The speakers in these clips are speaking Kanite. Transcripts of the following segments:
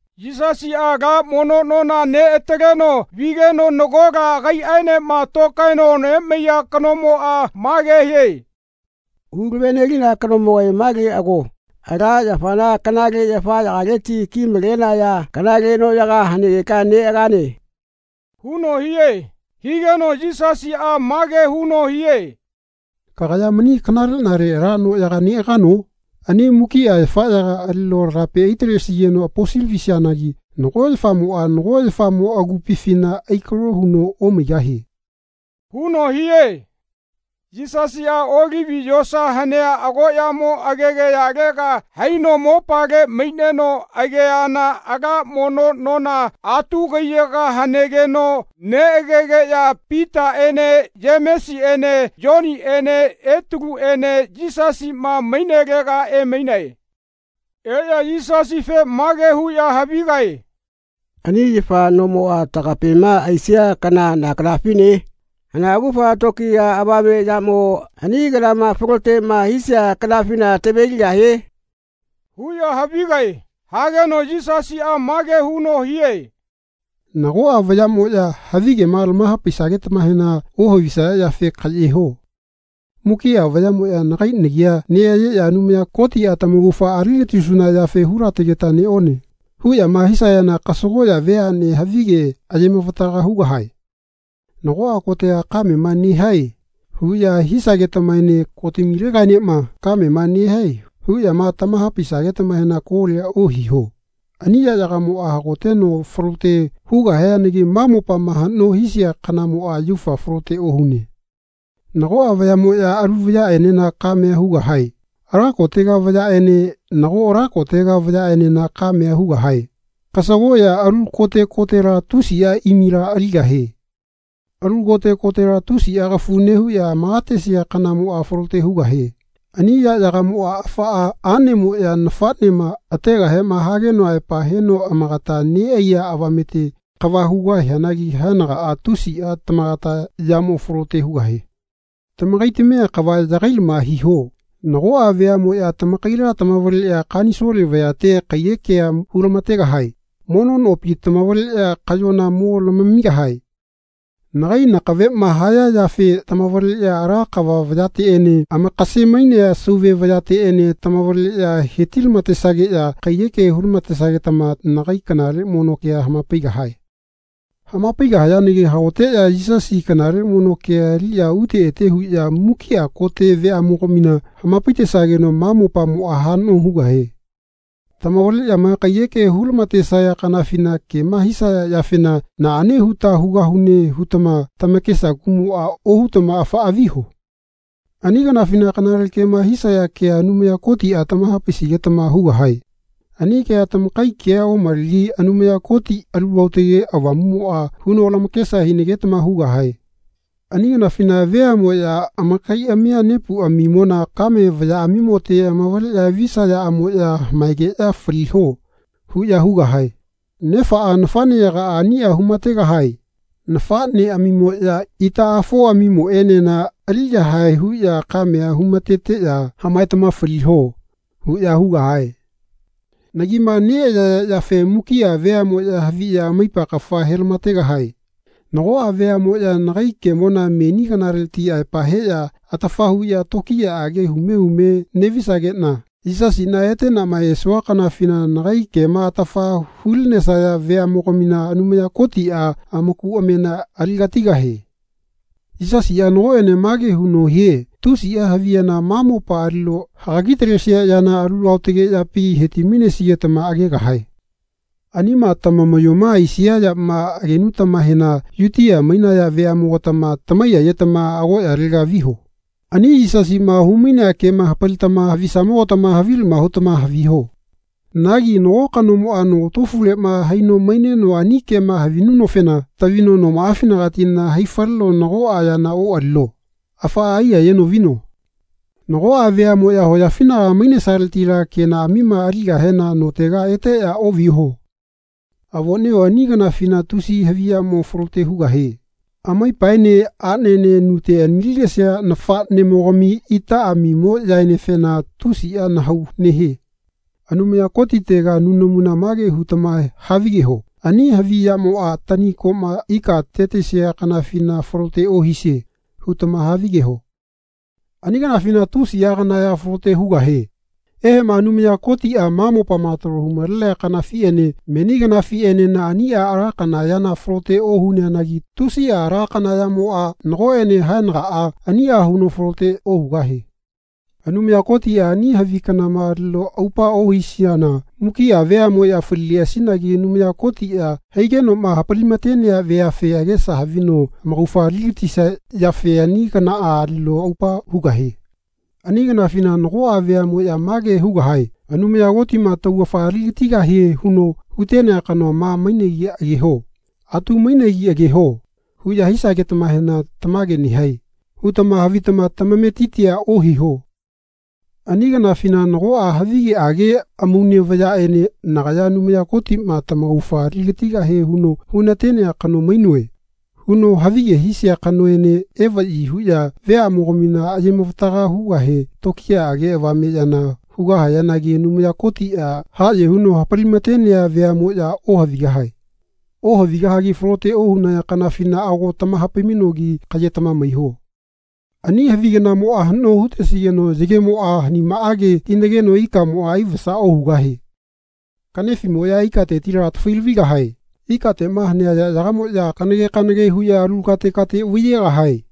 Yisasiꞌa ala mono nona neꞌataleno vigeno nagola agaiꞌaenema tokaeno nemaiya kanomoꞌa mage hie “Hulavenelina kanomogae male ago. Ala yafana kanale yafaꞌyagaleti kimalenaya kanale noꞌyaga hanegeka neꞌagane.” huno hie. Higeno Yisasiꞌa mage huno hie “Kagaya mani kanaleꞌnale ala noꞌyaga neꞌagano? Ani mukiꞌa yafaꞌyaga alino lagape aitalesigeno aposilavisianagi nago yafamoꞌa nago yafamo agupifina aikalo huno omaigahie.” huno hie. Yisasiꞌa Olivi yosa hanea agoꞌyamo agegayalega haino mopale maineno ageana ala mono nona atu kaiyaga hanegeno neꞌagegeꞌya Pitaꞌene Yemesiꞌene Yoniꞌene Etaluꞌene Yisasiꞌma mainelega emainae. Eꞌya Yisasife mage huꞌya havigae “Ani yafa nomoꞌa tagapema aisia kana na kanafine? Hana augafa tokiya avame yamo ani kanama faloteꞌma hisia kanafina taveligahie?” huꞌya havigae. Hageno Yisasiꞌa mage huno hie “Nagoꞌa vayaꞌmoꞌya havigema lamahapaisagetamahena ohavisaya yafe kaꞌye ho. Mukiꞌa vayaꞌmoꞌya nagai nagia neꞌayeꞌya ‘Anumaya Kotiꞌa tamaugafa aligatisuna yafe hulategeta neꞌone.” huꞌyama hisayana kasagoꞌya veaꞌne havige ayemavataga hugahae. “Nagoꞌa kotega kamema nehae.” huꞌya hisagetamaene “Kotamile-gaenema kamema nehae” huꞌyama tamahapaisagetamahena kolia ohiho. Ani yaꞌyagamoꞌa hagoteno falote hugahianagi ma mopama haꞌno hisia kanamoꞌa yaufa falote ohune. Nagoꞌa vayaꞌmoꞌya alu vayaꞌenena kamea hugahae. Ala kotega vayaꞌene nago ala kotega vayaꞌenena kamea hugahae. Kasagoꞌya alu kote kotela tusiꞌa imila aligahie. Alu kote kotela tusiꞌa kafu nehuꞌya amakatesia kanamoꞌa falote hugahie. Ani yaꞌyagamoꞌa afaꞌa aꞌnemoꞌya nafaꞌnema ategahema hageno aepa heno amagata neꞌaiya avamete kava hugahianagi haenagaꞌa tusiꞌa tamagata yamo falote hugahie. Tamakaitamia kava yagailama hiho. Nagoꞌa veaꞌmoꞌya tamakaila tamavaleꞌya kanisole vayate kaiyekea hulamategahae. Mono nopi tamavaleꞌya kaꞌyona mo lamamigahae. Nagai nakaveꞌma haya yafe tamavaleꞌya ala kava vayateꞌene amakasemainea sauve vayateꞌene tamavaleꞌya hetilamatesageꞌya kaiyekea hulamatesagetama nagai kanale mono kea hamapaigahae. Hamapaigahayanagi hagoteꞌya Yisasi kanale mono kea aliꞌya ute ete huꞌya mukiꞌa kote veaꞌmogamina hamapaitesageno ma mopamoꞌa haꞌno hugahie. Tamavaleꞌyama kaiyeke hulamatesaya kanafina kema hisaya yafena “Naꞌane huta hugahuneꞌ hutama tamakesa kuꞌmoꞌa ohutama afaꞌa viho. Ani kanafina kanale kema hisaya kea Anumaya Kotiꞌa tamahapainagetama hugahae. Ani kea tamakai kea omalegi Anumaya Koti Alu Aotage Avamuꞌmoꞌa huno lamakesa hinagetama hugahae. Ani kanafina veaꞌmoꞌya amakaiꞌami nepuꞌamimona kame vayaꞌamimote amavaleꞌya visayaꞌamoꞌya ‘Hamaegeꞌya faliho.’ huꞌya hugahae. Nefaꞌa nafaꞌneyagaꞌa aniꞌa humategahae. Nafaꞌneꞌamimoꞌya itaꞌafoꞌamimoꞌene-na aliyahae huꞌya kamea humateteꞌya ‘Hamaetama faliho.’ huꞌya hugahae. Nagima neꞌayaya yafe mukiꞌa veaꞌmoꞌya haviꞌya amaipa kafa helamategahae. Nagoꞌa veaꞌmoꞌya nagai kemona meni kanaleti aepa heꞌya atafa huꞌya tokiyaꞌage hume hume neꞌvisageꞌna Yisasiꞌna eteꞌnama esua kanafina nagai kema atafa hulinesaya veaꞌmogamina Anumaya Kotiꞌa amaku amamena aligatigahie. Yisasiꞌa nagoꞌene mage huno hie tusiꞌa havi yana ma mopa alino hagagitalesia yana alu aotage yapi hetimainesigetama agegahae. Anima tamamaꞌyoma aisia yama agenuta-mahena Yutia mainaya veaꞌmogatama tamaiyayetama agoꞌyalega viho. Ani Yisasiꞌma humainea kema hapalitama havisamogatama havilama hutama haviho. Nagi nago kanomoꞌa nogatofuleꞌma haino maineno ani kema havinunofena tavino nomaꞌafinagati haifaleno nagoꞌa yana oꞌalino. Afaꞌa aiyayeno vino. Nagoꞌa veaꞌmoꞌya hoyafinagama mainesaletila kenaꞌamima aligahena notega eteꞌya oꞌviho. Avoꞌnio ani kanafina tusiꞌa havi yamo falote hugahie. Amaipaene aꞌnene nute anilinesia nafaꞌnemogami itaꞌamimoꞌyaenefena tusiꞌa nahau nehie. Anumaya Kotitega nunamuna mage hutama havigeho “Ani havi yamoꞌa tani koꞌma ikate tisia kanafina falote ohisie.’ hutama havigeho. Ani kanafina tusiꞌa kana ya falote hugahie. Eheꞌma Anumaya Kotiꞌa ma mopama talo humalenea kanafiꞌene meni kanafiꞌenena aniꞌa ala kana yana falote ohuneanagi tusiꞌa ala kana yamoꞌa nagoꞌene haenagaꞌa aniꞌa huno falote ohugahie. Anumaya Kotiꞌa ani havi kanama alino aupa ohileꞌasina mukiꞌa veaꞌmoꞌya falileꞌasinagi Anumaya Kotiꞌa haigenoꞌma hapalimatenea veafe agesa havino amaugafa aligatisia yafe ani kanaꞌa alino aupa hugahie. Ani kanafina nagoꞌa veaꞌmoꞌya mage hugahae “Anumaya Kotiꞌma taugafa aligatigahie huno hutenea kanoa ma mainegi ageho. Atu mainegi ageho.” huꞌya hisagetamahena “Tamage nehae.” hutama havitama tamametitia ohiho. Ani kanafina nagoꞌa havigeꞌage amaune vayaꞌene “Nagaya Anumaya Kotiꞌma tamaugafa aligatigahie huno hunatenea kano mainoe.” huno havige hisia kanoene evaꞌyi huꞌya veaꞌmogamina ayemavataga hugahe tokiyaꞌage avame yana hugahayanagi Anumaya Kotiꞌa haꞌye huno hapalimatenea veaꞌmoꞌya ohavigahae. Ohavigahagi falote ohunaya kanafina ago tamahapaimainogi kaꞌyetama maiho. Ani havi kanamoꞌa haꞌno hutesigeno yagemoꞌa hanimaꞌage hinageno ikamoꞌa aivasa ohugahie. Kaꞌnefiꞌmoꞌya ikatetila atafailavigahie. Ikateꞌma hanea yaꞌyagamoꞌya kanage kanage huno alu kate kate vaiyegahie.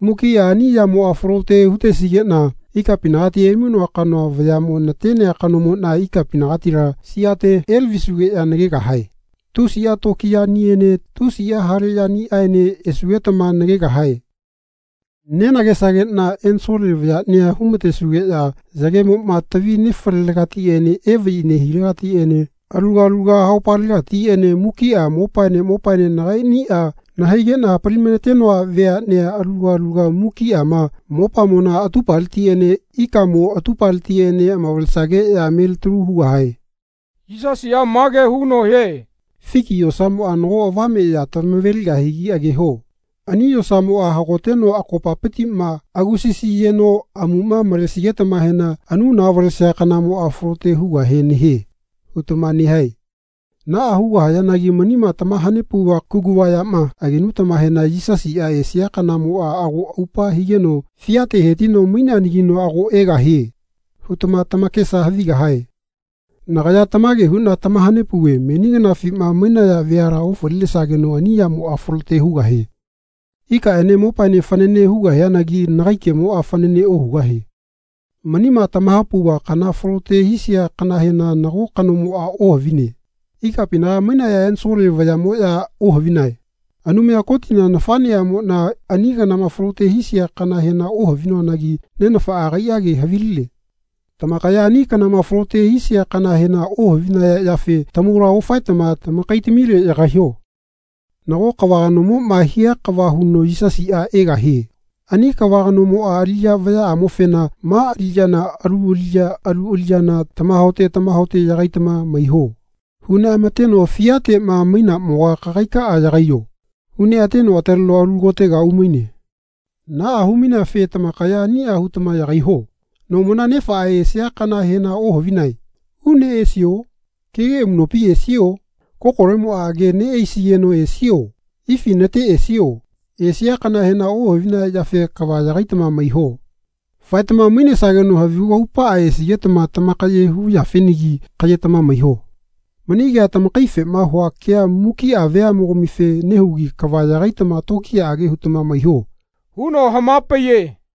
Mukiꞌa ani yamoꞌa falote hutesigeꞌna ikapinagati emainoa kanoa vayaꞌmo natenea kanomoꞌna ikapinagatila siate elavisugeꞌya nagegahae. Tusiꞌa tokiyaꞌniene tusiꞌa hale yaniꞌaene esugetama nagegahae. Nenagesageꞌna ensole vayaꞌnia humatesugeꞌya yagemoꞌma tavi nefalelegatiꞌene evaꞌyi nehilegatiꞌene aluga aluga haupalegatiꞌene mukiꞌa mopaene mopaene nagaiꞌniꞌa nahaigeꞌna hapalimatenoa veaꞌnea aluga aluga mukiꞌa ma mopamona atupaletiꞌene ikamo atupaletiꞌene amavalesageꞌya melitalu hugahae. Yisasiꞌa mage huno hie “Fiki yosamoꞌa nago avame ya tamaveligahigi ageho. Ani yosamoꞌa hagoteno akopapitiꞌma agusasiyeno amuꞌma malesigetamahena ‘Anuna valesia kanamoꞌa falote hugahe nehie.’ hutama nehae. Naꞌa hugahayanagi manima tamahanepauva kuguva yama agenutamahena “Yisasiꞌa esia kanamoꞌa ago aupa higeno fiate hetino maineanagino ago egahie.’ hutama tamakesa havigahae. Nagaya tamage huꞌna tamahanepauve meni kanafima mainaya veala ofalinesageno ani yamoꞌa falote hugahie. Ikaꞌene mopaene fanane hugahianagi nagai kemoꞌa fanane ohugahie. Manima tamahapauva kanama falote hisia kanahena nago kanomoꞌa ohavine. Ikapinaga mainaya ensole vayaꞌmoꞌya ohavinae. Anumaya Kotina nafaꞌneꞌamoꞌna ani kanama falote hisia kanahena ohavinoanagi nenafaꞌa agaiꞌage haviline. Tamakaya ani kanama falote hisia kanahena ohavinaya yafe tamaula ofaetama tamakaitamile yagaiho. Nago kava kanomoꞌma hia kava huno Yisasiꞌa egahie. Ani kava kanomoꞌa aliꞌya vayaꞌamofena ‘Ma aliꞌyana alu aliꞌya alu aliꞌyana tamahaote tamahaote yagaitama maiho.’ huneꞌamateno “Fiateꞌma mainamoga kagaikaꞌa yagaiyo.” huneꞌateno ataleno alu kotega umaine. Naꞌa humaineafe tamakaya aniꞌa hutama yagaiho. Nomona nefaꞌma esia kanahena ohavinae. Une esio? Kege amuꞌnopi esio? Kokolemoꞌa age neꞌaisigeno esio? Ifi nate esio? Esia kanahena ohavinaya yafe kava yagaitama maiho. Faetama mainesageno havigu aupaꞌa esigetama tamakaye hu yafenagi kaꞌyetama maiho. Mani kea tamakaifema hua kea mukiꞌa veaꞌmogamife nehugi kava yagaitama tokiyaꞌage hutama maiho.” huno hamapaiye.